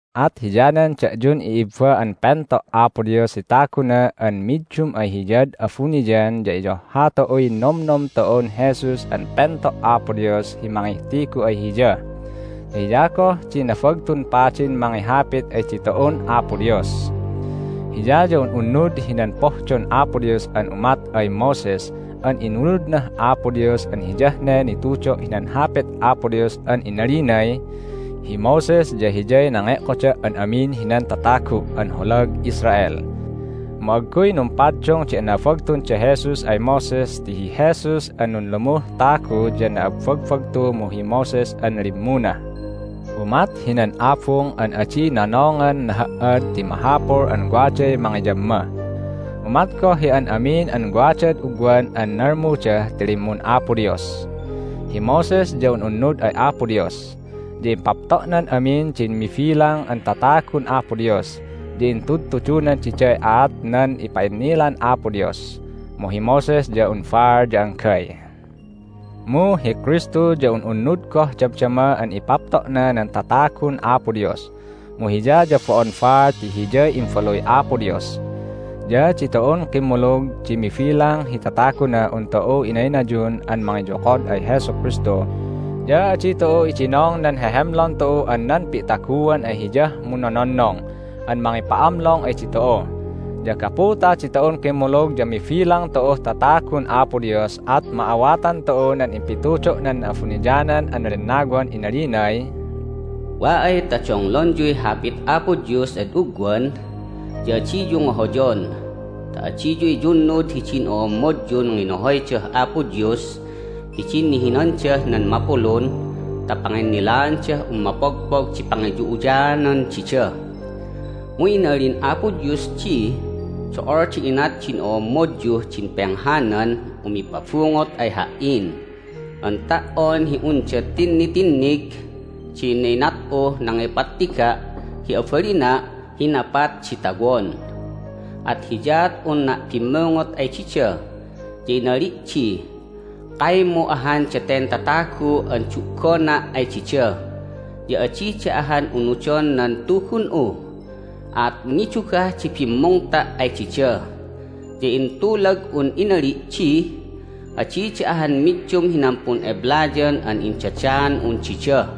At hiyanan da'yun i'ibba an pento' Apo Dios hi taguna an middum ay Hiyad abuniyan ya iyohha tu'uy nomnom tu'un Jesus an pento' Apo Dios hi mangihtigu ay Hiya, ya hiya goh di Nabagtun Padin mangihapit ay ditu'un Apo Dios. Hiya ya un'unnud hinan pohdon Apo Dios an umat ay Moses an inunudnah Apo Dios an hiyah ne nitudo' hinan Hapit Apo Dios an inalinay, "Hi Moses ya hiyay nange'koda' an amin hinan tatagu' an holag Israel." Mu agguy numpaddung di anabagtun da Jesus ay Moses ti hi Jesus an nunlumuh tagu ya na'abbagbagtu mu hi Moses an limmuna. Umat hinan abung an adi nonongan naha"ad ti mahapul an waday mangiyamma. Umat goh hi an amin an wadad ugwan an nalmuda ti limmun Apo Dios. Hi Moses ya un'unnud ay Apo Dios. Ya impapto'nan amin din mibilang an tatagun Apo Dios, ya intudtudunan diday aat nan ipa'innilan Apo Dios. Mu hi Moses ya un baal ya anggay. Mu hi Kristu ya un'unnud goh damdama an ipapto'na nan tatagun Apo Dios, mu Hiya ya bo'on baal ti Hiyay Imbaluy Apo Dios. Ya ditu'un kimmulug di mibilang hi tatagunah un tu'u inaynayun an mangiyokod ay Jesu Kristu, ya adi tu'u idinong nan hehemlon tu'u an nan pi'taguan ay Hiyah munnononnong an mangipa'amlong ay ditu'u. Ya gapu ta ditu'un kimmulug ya mibilang tu'uh tatagun Apo Dios at ma'awatan tu'u nan impitudo' nan Na'abuniyanan an Lennawan inalinay, "Wa ay ta donglonyuy Hapit Apo Dios ad ugwan ya adiyu ngohoyon ta adiyu iyunnud hidin o'ommodyun nginohoydah Apo Dios hidin nihinandah nan mapulun ta panginnilaandah un mapogpog di pangiyu'uyaanan dida. Mu inalin Apo Dios di, Do'ol di inat din o'ommodyuh din penghanan umipabungot ay Ha"in an ta"on hi unda tinnitinnig din inat'uh nangipattiga' hi abalina' hi napat di tawon! At hiyaat unna' bimmungot ay dida, ya inali' di, Kaymu ahan daten tatagu an du'gona' ay dida, ya adida ahan unudon nan Tugun'u! At nidugah di bimmungta' ay dida, ya intulag'un inali' di, Adida ahan middum hinan pun'eblayan an indadaan'un dida!"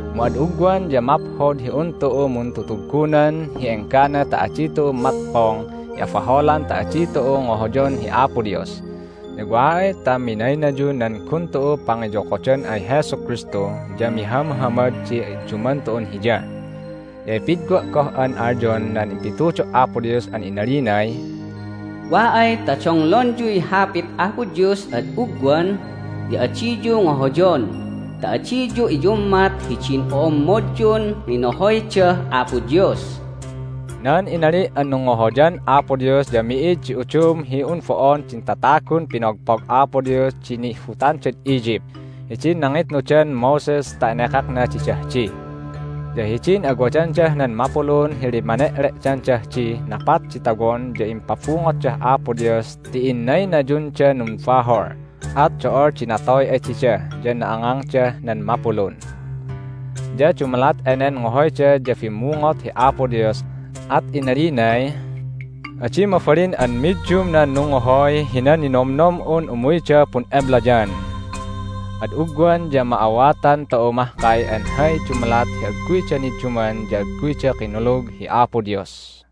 Mu ad ugwan ya maphod hi un tu'u muntutuggunan hi enggana ta adi tu'u matpong hi abaholan ta adi tu'u ngohoyon hi Apo Dios. Ya wa ay ta minaynayun nan gun tu'u pangiyokodan ay Jesu Kristu ya mihamhamad di idduman tu'un Hiya. Ya ipidwa' goh an alyon nan impitudo' Apo Dios an inalinay, "Wa ay ta donglonyuy Hapit Apo Dios ad ugwan ya adiyu ngohoyon ta adiyu iyummat hidin o'ommodyun nginohoydah Apo Dios." Nan inali' an nungngohoyan Apo Dios ya mi'id di udum hi un bo'on din tatagun pinogpog Apo Dios di nihbutandad Egypt hidin nangitnudan Moses ta enekakna didah di. Ya hidin awadandah nan mapulun hi limmane'le'dandah dih napat di tawon ya impabungotdah Apo Dios ti innaynayundan numbahol, at do'ol di natoy ay dida, ya na'angangdah nan mapulun. Ya dumalat enen ngohoyda ya bimmungot hi Apo Dios, at inalinay, "Adi mabalin an middum nan nungngohoy hinan ninomnom'un umuyda pun'eblayan!" Ad ugwan ya ma'awatan tu'u mahkay an hay dumalat hi agguyda nidduman ya agguyda kinulug hi Apo Dios.